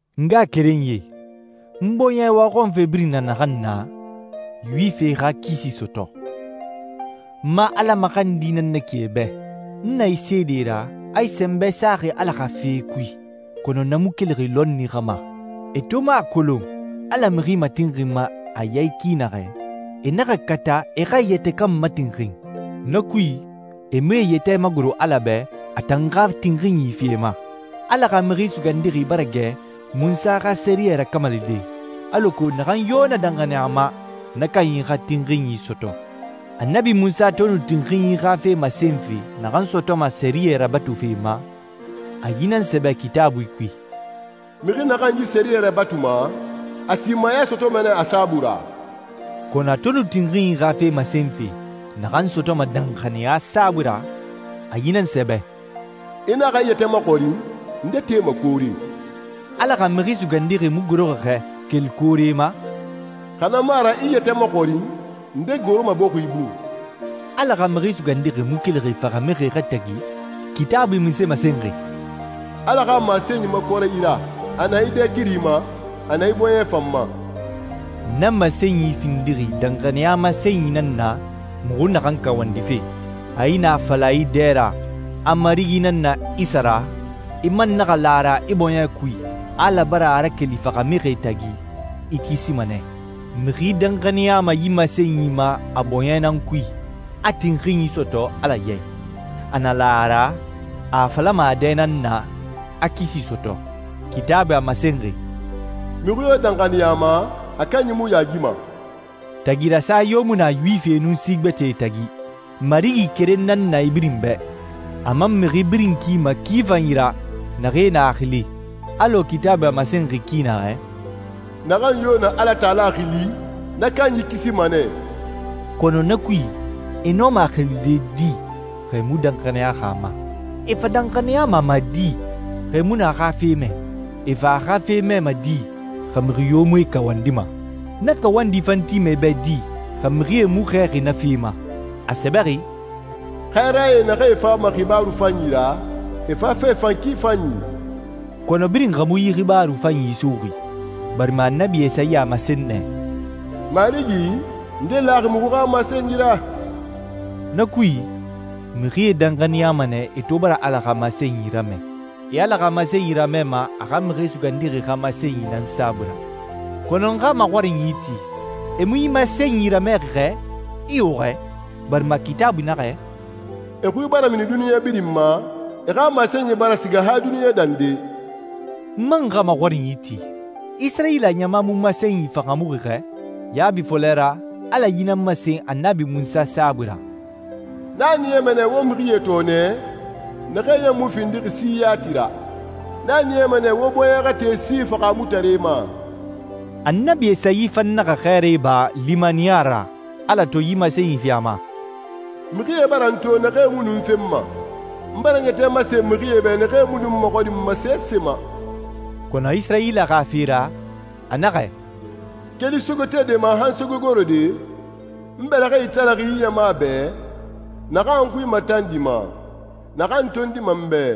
N ngaxakerenyie, n bɔɲɛ waxɔnfe birin na naxan na, Yuwifie xa kisi sɔtɔ. N ma Ala maxandi nan na ki e bɛ. N na e seede ra, a e sɛnbɛ saxi Ala xa fee kui, kɔnɔ na mu kelixi lɔnni xa ma. E to mu a kolon Ala mixi matinxinma a ya i ki naxɛ, e naxa kata e xa e yɛtɛ kan matinxin. Na kui, e mu e yɛtɛ magoro Ala bɛ a tan xa tinxinyi fi e ma. Ala xa Mixi Sugandixi bara gɛ Munsa xa sɛriyɛ rakamalide, alako naxan yo na danxaniya a ma, na kanyi xa tinxinyi sɔtɔ. Annabi Munsa to nu tinxinyi xa fe masenfe naxan sɔtɔma sɛriyɛ rabatufe ma, a yi nan sɛbɛ Kitaabui kui, «Mixi naxan yi sɛriyɛ rabatuma a simaya sɔtɔma nɛ a saabui ra.» Kɔnɔ a to nu tinxinyi xa fe masenfe naxan sɔtɔma danxaniya saabui ra, a yi nan sɛbɛ, «I naxa i yɛtɛ maxɔrin, ‹Nde tema koore?›» Ala xa Mixi Sugandixi mu goroxi xɛ keli koore ma? «Xa na mu a ra i i yɛtɛ maxɔrin, ‹Nde goroma bɔxi bun?›» Ala xa Mixi Sugandixi mu kelixi faxamixie xa tagi? Kitaabui munse masenxi? «Ala xa masenyi makɔrɛ i ra. A na i dɛ kiri ma, a na i bɔɲɛ fan ma.» Na masenyi findixi danxaniya masenyi nan na muxu naxan kawandife: A i na a fala i dɛ ra a Marigi nan na Isa ra, i man naxa la a ra i bɔɲɛ kui a Ala bara a rakeli faxamixie tagi, i kisima nɛ. Mixi danxaniyama yi masenyi ma a bɔɲɛ nan kui, a tinxinyi sɔtɔ Ala ya i. A na la a ra, a a falama a dɛ nan na, a kisi sɔtɔ. Kitaabui a masenxi, «Mixi yo danxaniya a ma, a kanyi mu yaagima.» Tagi rasa yo mu na Yuwifie nun si gbɛtɛe tagi. Marigi keren nan na e birin bɛ, a man mixi birin kima ki fanyi ra naxee na a xili. Alɔ Kitaabui a masenxi ki naxɛ, «Naxan yo na Alatala xili, na kanyi kisima nɛ.» Kɔnɔ na kui, e nɔma a xilide di xa e mu danxaniyaxi a ma? E fa danxaniyama a ma di xa e mu nu a xa fe mɛ? E fa a xa fe mɛma di xa mixi yo mu e kawandima? Na kawandi fan tima e bɛ di xa mixie mu xɛɛxi na fe ma? A sɛbɛxi, «Xɛɛrae, naxee fama xibaaru fanyi ra, e fafe fan ki fanyi!» Kɔnɔ birin xa mu yi xibaaru fanyi suxuxi, barima Annabi Esayi a masen nɛ, «Marigi, nde laxi muxu xa masenyi ra?» Na kui, mixie danxaniyama nɛ e to bara Ala xa masenyi ramɛ. E Ala xa masenyi ramɛma a xa Mixi Sugandixi xa masenyi nan saabui ra. Kɔnɔ n xa maxɔrinyi ti, e mu yi masenyi ramɛxi xɛ? Iyo xɛ, barima Kitaabui naxɛ, «E xui bara mini duniɲa birin ma, e xa masenyi bara siga han duniɲa dande.» N man xa maxɔrinyi ti, Isirayila ɲama mu masenyi fahaamuxi xɛ? Yaabi fɔlɛ ra, Ala yi nan masen Annabi Munsa saabui ra, «N a niyama nɛ wo mixie tɔɔnɛ naxee ɲan mu findixi si yati ra. N a niyama nɛ wo bɔɲɛ xa te si fahaamutare ma.» Annabi Esayi fan naxa xɛɛra iba limaniya ra Ala to yi masenyi fi a ma, «Mixie bara n to naxee mu nu n fenma. N bara n yɛtɛ masen mixie bɛ naxee mu nu n maxɔrinma sese ma.» Kɔnɔ Isirayila xa fe ra, a naxɛ, «Keli sogetede ma han sogegorode, n bɛlɛxɛe italaxi yi ɲama bɛ, naxan n xui matandima, naxan tondima n bɛ.»